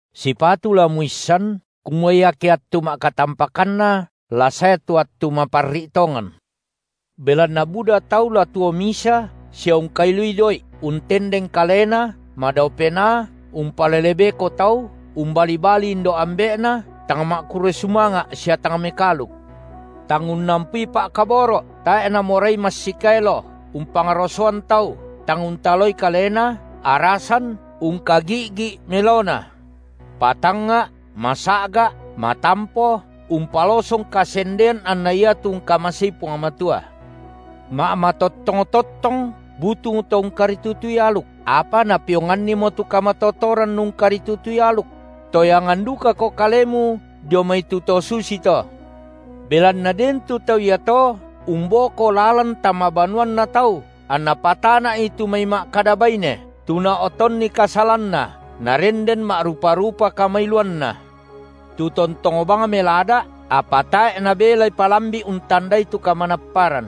Sipatu la muissan, kumua iake attu ma’katampakanna la sae tu attu maparri’ tongan. Belanna buda tau la tuo misa sia ungkailui doi’, untendeng kalena, madao penaa, umpalele beko tau, umbali-bali indo’-ambe’na, tang ma’kurre sumanga’ sia tang mekaaluk; tang unnampui pa’kaboro’, tae’ namorai massikaelo, umpangrosoan tau, tang untaloi kalena, arasan, ungkagi’gi melona, patangnga’, masa’ga’, matampo, umpalosong kasendean anna iatu ungkamasei Puang Matua. Ma’matottong-tottong butung to ungkaritutui aluk, apa napeongannimo tu kamatotoran ungkaritutui aluk; toyangan dukako kalemu dio mai tu to susito. Belanna den tu tau iato umboko lalan tama banuanna tau anna patana’i tu mai ma’kada baine, tu nao’tonni kasalanna, narenden ma’rupa-rupa kamailuanna, tu tontong bang melada’, apa tae’ nabelai palambi’ untandai tu kamanapparan.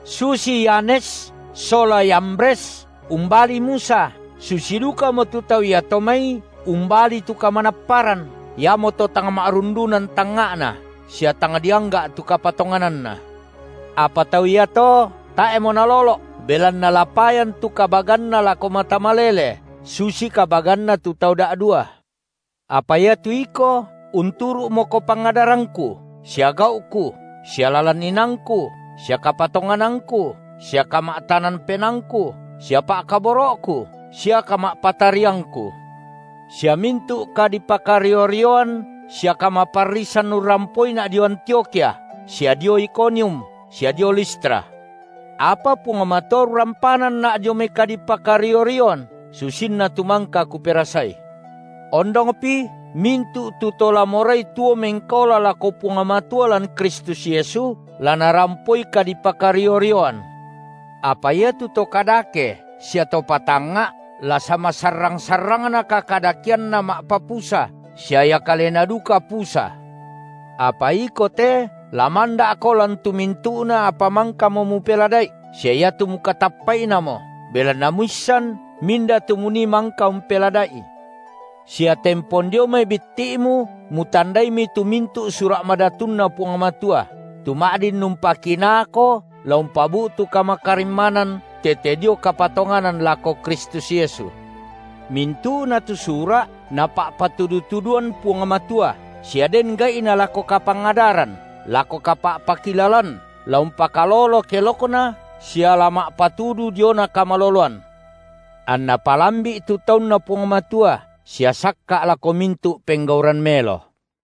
Susi Yanes sola Yambres umbali Musa, susi dukamo tu tau iato mai umbali tu kamanapparan, iamoto tang ma’rundunan tangnga’na sia tang diangga’ tu kapatongananna. Apa tau iato tae’mo nalolo’, belanna la payan tu kabaganna lako mata malele susi kabaganna tu tau da’dua. Apa iatu iko unturu’moko pangadarangku sia gau’ku, sia lalan inaangku sia kapatonganangku sia kama’tanan penaangku sia pa’kaboro’ku sia kama’patariangku. Sia mintu’ kadipakario-rioan sia kamaparrisan urrampoina’ dio Antiokhia sia dio Ikonium sia dio Listra. Apa Puang Matua urrampananna’ dio mai kadipakario-rioan, susinna tu mangka kuperasai. Ondongpi, mintu’ tu to la morai tuo mengkaola lako Puang Matua lan Kristus Yesu, la narampoi kadipakario-rioan. Apa iatu to kadake sia to patangnga’ la samasarrang-sarrangna kakadakeanna ma’papusa sia ia kalena duka pusa. Apa iko te la manda’ko lan tu mintu’na apa mangkamo mupelada’i, sia iatu mukatappa’inamo, belanna muissan minda tu munii mangka umpelada’i; sia tempon dio mai bitti’mu mutandaimi tu mintu’ Sura’ MadatunNa Puang Matua, tu ma’din umpakinaako la umpabu’tu kamakarimmanan tete dio kapatonganan lako Kristus Yesu. Mintu’na tu Sura’ Napa’patudu-tuduan Puang Matua sia den gai’na lako kapangadaran, lako kapa’pakilalan, la umpakalolo kelokna sia la ma’patudu diona kamaloloan, anna palambi’ tu taunNa Puang Matua, sia sakka’ lako mintu’ penggauran melo.